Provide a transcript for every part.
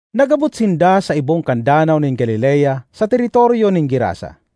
Nag-abot sinda sa ibong kan Danaw nin Galilea sa teritoryo nin Gerasa.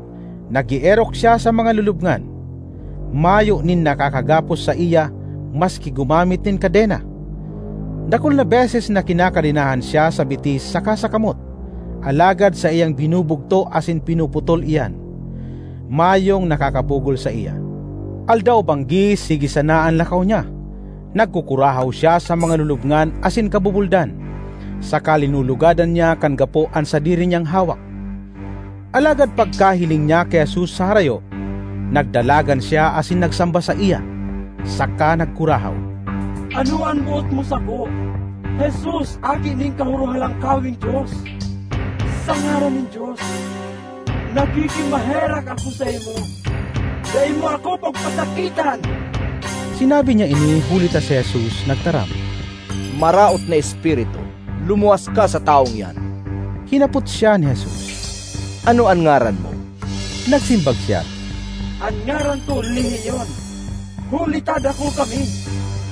Nag-eerok siya sa mga lulubngan. Mayo nin nakakagapos saiya maski gumamit nin kadena. Dakul na beses na kinakadenahan siya sa bitis saka sa kamot, alagad saiyang binubugto asin pinuputol iyan; mayong nakakapugol saiya. Aldaw-banggi sige sana an lakaw niya, nagkukurahaw siya sa mga lulubngan asin kabubuldan, saka linulugadan niya kan gapo an sadiri niyang hawak. Alagad pagkahiling niya ki Jesus sa harayo, nagdalagan siya asin nagsamba saiya, saka nagkurahaw, “Ano an boot mo sako, Jesus aki nin Kahorohalangkaweng Dios? Sa ngaran nin Dios, nakikimaherak ako saimo, dai mo ako pagpasakitan!” (Sinabi niya ini huli ta si Jesus nagtaram, “Maraot na espiritu, lumuwas ka sa tawong iyan!”) Hinapot siya ni Jesus, “Ano an ngaran mo?” Nagsimbag siya, “An ngaran ko ‘Lehiyon’ huli ta dakul kami!”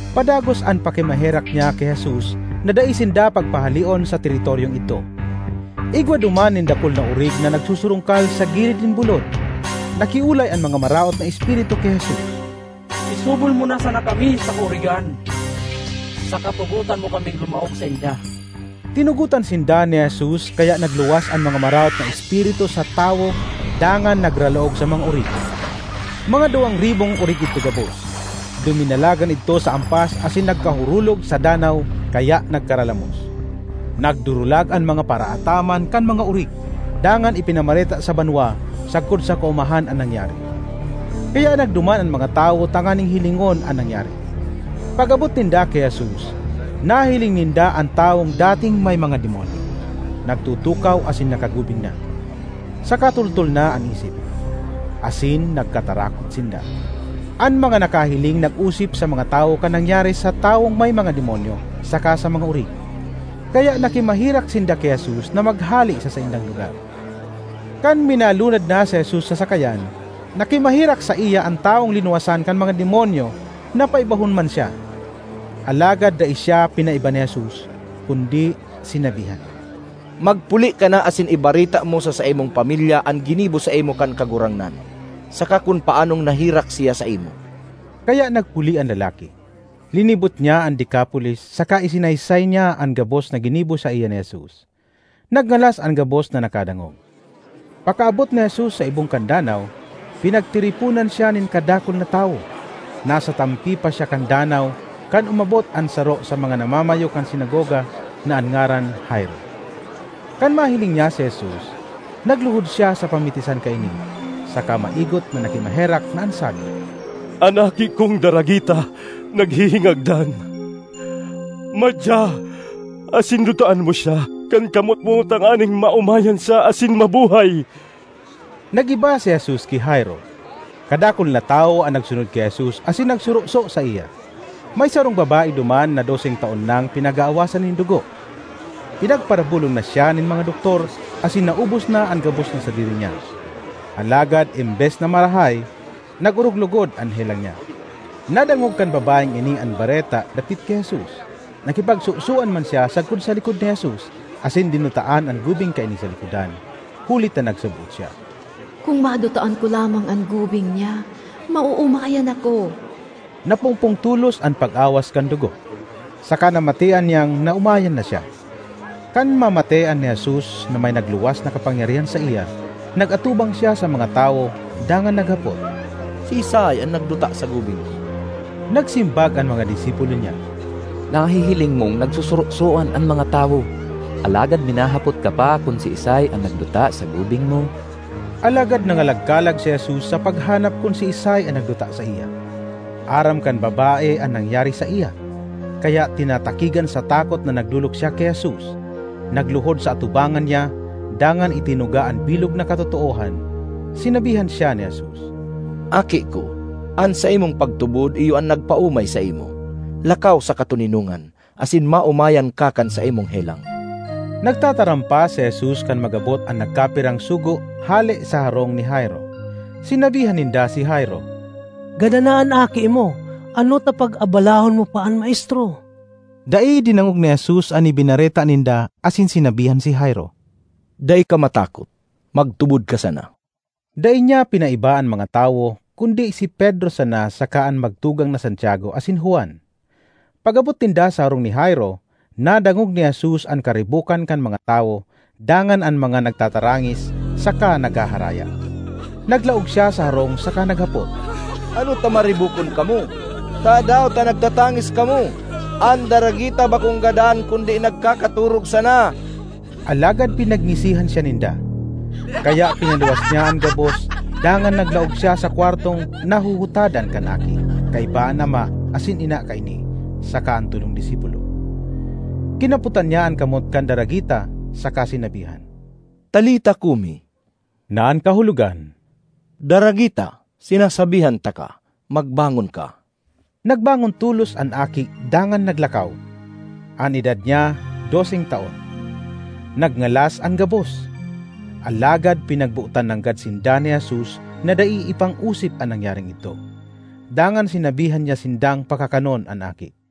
Padagos an pakimaherak niya ki Jesus na dai sinda pagpahaleon sa teritoryong idto. Igwa duman nin dakul na orig na nagsusurungkal sa gilid nin bulod. Nakiolay an mga maraot na espiritu ki Jesus, “Isubol mo na sana kami sa kaorigan saka tugotan mo kaming lumaog sainda.” Tinugotan sinda ni Jesus kaya nagluwas an mga maraot na espiritu sa tawo dangan nagralaog sa mga orig. Mga duwang ribong orig idto gabos; duminalagan idto sa ampas asin nagkahurulog sa danaw kaya nagkaralamos. Nagdurulag an mga paraataman kan mga orig dangan ipinamareta sa banwa sagkod sa kaomahan an nangyari. Kaya nagduman an mga tawo tanganing hilingon an nangyari. Pag-abot ninda ki Jesus nahiling ninda an tawong dating may mga demonyo, nagtutukaw asin nakagubing na, saka toltol na an isip; asin nagkatarakot sinda. An mga nakahiling nag-osip sa mga tawo kan nangyari sa tawong may mga demonyo saka sa mga orig. Kaya nakimaherak sinda ki Jesus na maghale sa saindang lugar. Kan minalunad na si Jesus sa sakayan, nakimaherak saiya an tawong linuwasan kan mga demonyo na paibahon man siya. Alagad dai siya pinaiba ni Jesus kundi sinabihan, “Magpuli ka na asin ibareta mo sa saimong pamilya an ginibo saimo kan Kagurangnan saka kun paanong naherak siya saimo.” Kaya nagpuli an lalaki; linibot niya an Decapolis saka isinaysay niya an gabos na ginibo saiya ni Jesus. Nagngalas an gabos na nakadangog. Pakaabot ni Jesus sa ibong kan danaw, pinagtiriponan siya nin kadakul na tawo. Nasa tampi pa siya kan danaw, kan umabot an saro sa mga namamayo kan sinagoga na an ngaran Jairo. Kan mahiling niya si Jesus, nagluhod siya sa pamitisan kaini, saka maigot na nakimaherak na an sabi, “An aki kong daragita naghihingagdan. Madya asin dutaan mo siya kan kamot mo tanganing maomayan siya asin mabuhay!” Nag-iba si Jesus ki Jairo. Kadakul na tawo an nagsunod ki Jesus asin nagsoroso saiya. May sarong babae duman na doseng taon nang pinag-aawasan nin dugo. Pinagparabolong na siya nin mga doktor asin naubos na an gabos na sadiri niya, alagad embes na marahay, nag-orog logod an helang niya. Nadangog kan babaeng ini an bareta dapit ki Jesus, nakipagsosoan man siya sagkod sa likod ni Jesus asin dinutaan an gubing kaini sa likodan, huli ta nagsaboot siya, “Kun madutaan ko lamang an gubing niya, maoomayan ako.” Napungpong tolos an pag-awas kan dugo, saka namatean niyang naomayan na siya. Kan mamatean ni Jesus na may nagluwas na kapangyarihan saiya, nag-atubang siya sa mga tawo dangan naghapot, “Siisay an nagduta sa gubing ko?” Nagsimbag an mga disipulo niya, “Nahihiling mong nagsusurosoan an mga tawo, alagad minahapot ka pa kun siisay an nagduta sa gubing mo?” Alagad nangalagkalag si Jesus sa paghanap kun siisay an nagduta saiya. Aram kan babae an nangyari saiya, kaya tinatakigan sa takot na nagdolok siya ki Jesus, nagluhod sa atubangan niya, dangan itinuga an bilog na katotoohan. Sinabihan siya ni Jesus, “Aki ko, an saimong pagtubod iyo an nagpaomay saimo. Lakaw sa katoninongan, asin maomayan ka kan saimong helang.” Nagtataram pa si Jesus kan mag-abot an nagkapirang sugo hale sa harong ni Jairo. Sinabihan ninda si Jairo, “Gadan na an aki mo. Ano ta pag-abalahon mo pa an maestro?” Dai dinangog ni Jesus an ibinareta ninda asin sinabihan si Jairo, “Dai ka matakot, magtubod ka sana.” Dai niya pinaiba an mga tawo kundi si Pedro sana saka an magtugang na Santiago asin Juan. Pag-abot ninda sa harong ni Jairo, nadangog ni Jesus an karibokan kan mga tawo dangan an mga nagtatarangis saka naghaharaya. Naglaog siya sa harong saka naghapot, “Ano ta maribokon kamo? Tadaw ta nagtatangis kamo? An daragita bakong gadan kundi nagkakatorog sana!” Alagad pinagngisihan siya ninda. Kaya pinaluwas niya an gabos dangan naglaog siya sa kwartong nahuhutadan kan aki kaiba an ama asin ina kaini saka an tolong disipulo. Kinapotan niya an kamot kan daragita saka sinabihan, “Talita cumi,” na an kahulogan, “Daragita, sinasabihan taka, magbangon ka!” Nagbangon tolos an aki dangan naglakaw. (An edad niya doseng taon.) Nagngalas an gabos. Alagad pinagbotan nanggad sinda ni Jesus na dai ipangosip an nangyaring idto. Dangan sinabihan niya sindang pakakanon an aki.